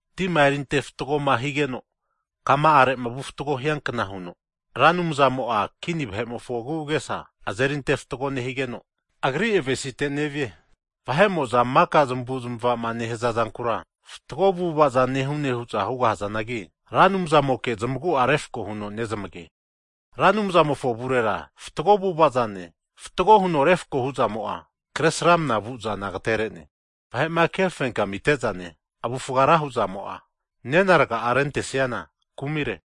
Tima eriante fatgo'ma higeno kama'are vu fatgo hiankna huno, Ra Anumzamo'a kini vahe'mofo agu'agesa azeri antefatgo nehigeno, Agri avesite nevie. Vahe'mo'za maka zamavu'zamavama nehaza zankura, fatgo avu'avaza nehune hu'za hugahazanagi, Ra Anumzamoke zamagu'a refako huno nezamage. Ra Anumzamofo avurera fatgo avu'ava zane, fatgo huno refako hu'zamo'a, kre sramnama vu zana agatere'ne. Vahe'ma ke fenkamite zane, avufga ra hu'zamo'a, nena raga'a rentesiana kumire.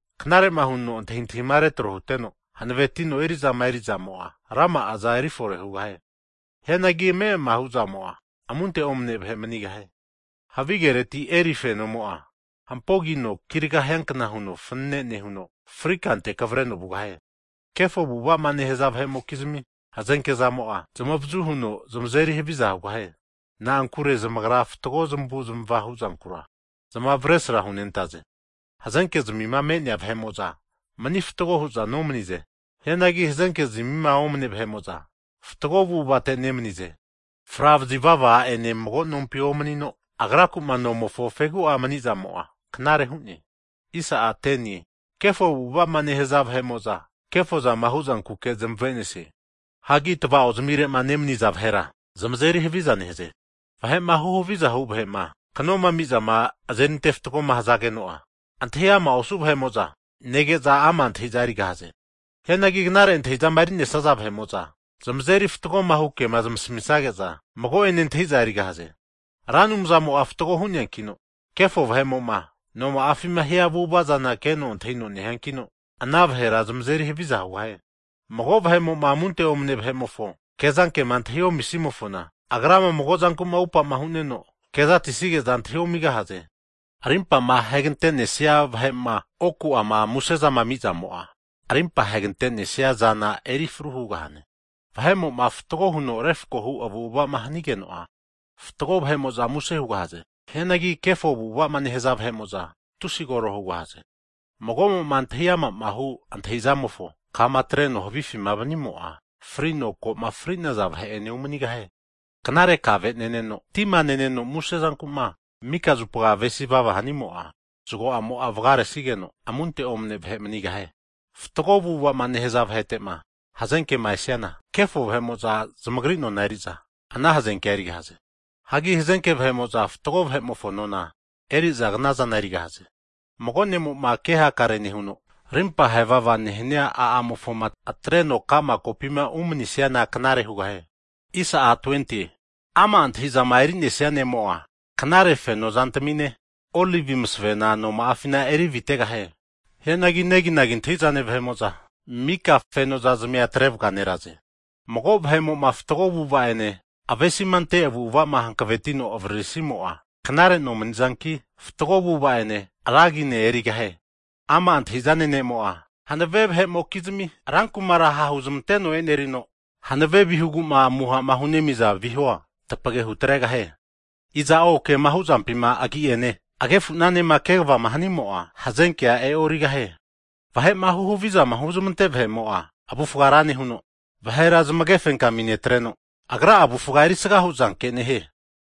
Knare huno antahintahima retro huteno, hanavetino erizama erizamo'a, rama'aza erifore hugahie. Hianagi ame'ama huzamo'a, amunte omane vahe manigahie. Havigereti eri fenomo'a, hampogino kirga hiankna huno fanane nehuno, frikante kavreno vugahie. Kefo avu'avama nehaza vahe'mokizmi hazenke'zamo'a, zamavazu huno zamazeri haviza hugahie. Na'ankure zamagra fatgo zamavu'zamava huzankura, zamavesra hunentaze. Hazenke zamima me'nea vahe'mo'za mani fatgo hu'za nomanize. Hianagi hazenke zamima omane vahe'moza fatgo avu'avate nemanize. Fra vazivava a'ene mago nompi omanino, agraku'ma nomofo fegu'a mani'zamo'a, knare hu'ne. Kefo avu'avama nehaza vahe'moza, kefo zama huzankuke zamavenesie. Hagi tava'ozmirema nemaniza vahe'ra zamazeri haviza nehaze. Vahe'ma huhaviza'ma hu vahe'ma knoma amiza azeri fatgoma hazageno'a, antahi ama osu vahe'moza negeza ama' antahi'zana erigahaze. Hianagi knare antahizama eri'nesaza vahe'mo'za zamazeri fatgohu kema zamasamisage'za mago'ene antahi'za erigahaze. Ra Anumzamo'a fatgo hu'neankino, kefo vahe'mo'ma noma'afima hia avu'ava'zana keno antahino nehiankino, ana vahera zamazeri haviza hugahie. Mago vahe'mo'ma amunte omane vahe'mofo kezanke'ma antahi omisimofona, agrama mago zanku'ma upama hu'neno kezatisige'za antahi omigahaze. Rimpama hegante'nesia vahe'ma oku'ama musezama amizamo'a arimpa ahegante'nesia zana eri fru hugahane. Vahe'mo'ma fatgo huno refako hu avu'avama hanigeno'a, fatgo vahe'mo'za muse hugahaze. Hianagi kefo avu'avama nehaza vahe'mo'za, tusi koro hugahaze. Mago'mo'ma antahi ama'ma hu antahizamofo kama atreno havifima vanimo'a, frino ko'ma fri'naza vahe'ene umanigahie. Knare kave neneno, tima neno muse zanku'ma mika zupama avesivava hanimo'a, zgo'amo'a vgaresigeno amunte omane vahe manigahie. Fatgo avu'avama nehaza vahetema hazenkema esiana, kefo avu'avama nehaza vahe'mo'za zamagri nona eri'za ana hazenkea erigahaze. Hagi hazenke vahe'mo'za fatgo vahe'mofo nona eriza knazana erigahaze. Mago ne'moma kehakare nehuno, rimpa hevava nehania a'amofoma atreno ka'ma kopima umanisiana knare hugahie. Ama' antahi'zama eri'nesia ne'mo'a, knare feno zantamine olivi masavena noma'afina erivitegahie. Hianagi neginagi antahizane vahe'mo'za, mika fenozazmia atre vganeraze. Mago vahe'mo'ma fatgo avu'ava ene avesima ante avu'ava'ma hankavetino avaririsimo'a, knare nomani'zanki, fatgo avu'ava'ene ra agine erigahie. Ama' antahi'zane ne'mo'a, hanave vahe'mokizmi rankumara ha' huzamanteno e'nerino, hanave vihugu'ma amuha'ma hunemiza vihua tapage hutregahie. Iza'o kema hu'zampima agi'ene agnefu'nanema kvama hanimo'a, hazenkea e'origahie. Vahe'ma huhavizama huzamante vahe'mo'a, avufga ra nehuno, vahera zamage fenkami netreno, agra'a avufga erisga hu'zanke nehie.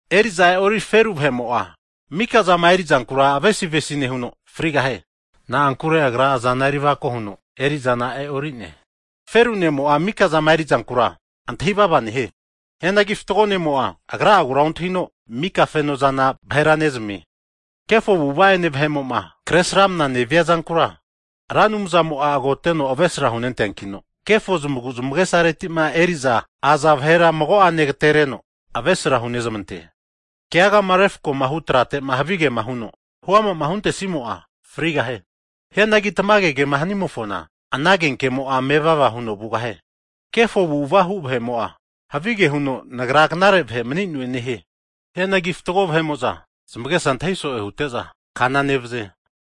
Eri'za e'ori feru vahe'mo'a mika zama eri'zankura avesi'avesi nehuno, frigahie. Na'ankure agra azana eri avako huno, erizana e'orine. Feru ne'mo'a mika'zama eri'zankura antahi'vava nehie. Hianagi fatgo ne'mo'a agra'agura ontahino, mika feno'zana vahera nezamie. Kefo avu'ava ene vahe'mo'ma kresramnama nevia zankura, Ra Anumzamo'a agoteno avesra hunenteankino, kefo zamagu'zamage'saretima eri'za aza vahera mago'ane agatereno avesra hunezamante. Keagama refako hu tratema havigema huno hu ama'ma huntesimo'a, frigahie. Hianagi tamage kema hanimofona, ana agenke'amo'a mevava huno vugahie. Kefo avu'avama hu vahe'mo'a, havige huno nagra knare vahe mani'noe nehie. Hianagi fatgo vahe'mo'za zamagesa antahi so'e hute'za kana nevaze.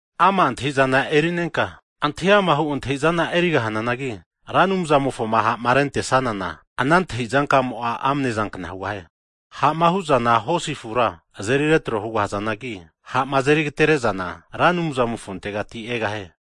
Ama' antahi'zana eri'nenka, antahi ama'ma hu antahizana erigahananagi, Ra Anumzamofoma ha'ma rente'sanana ana antahi zankamo'a amne zankna hugahie. Ha'ma huzana hosi afura azeri retro hugahazanagi, ha'ma azeri'agatere zana, Ra Anumzamofontegati egahie.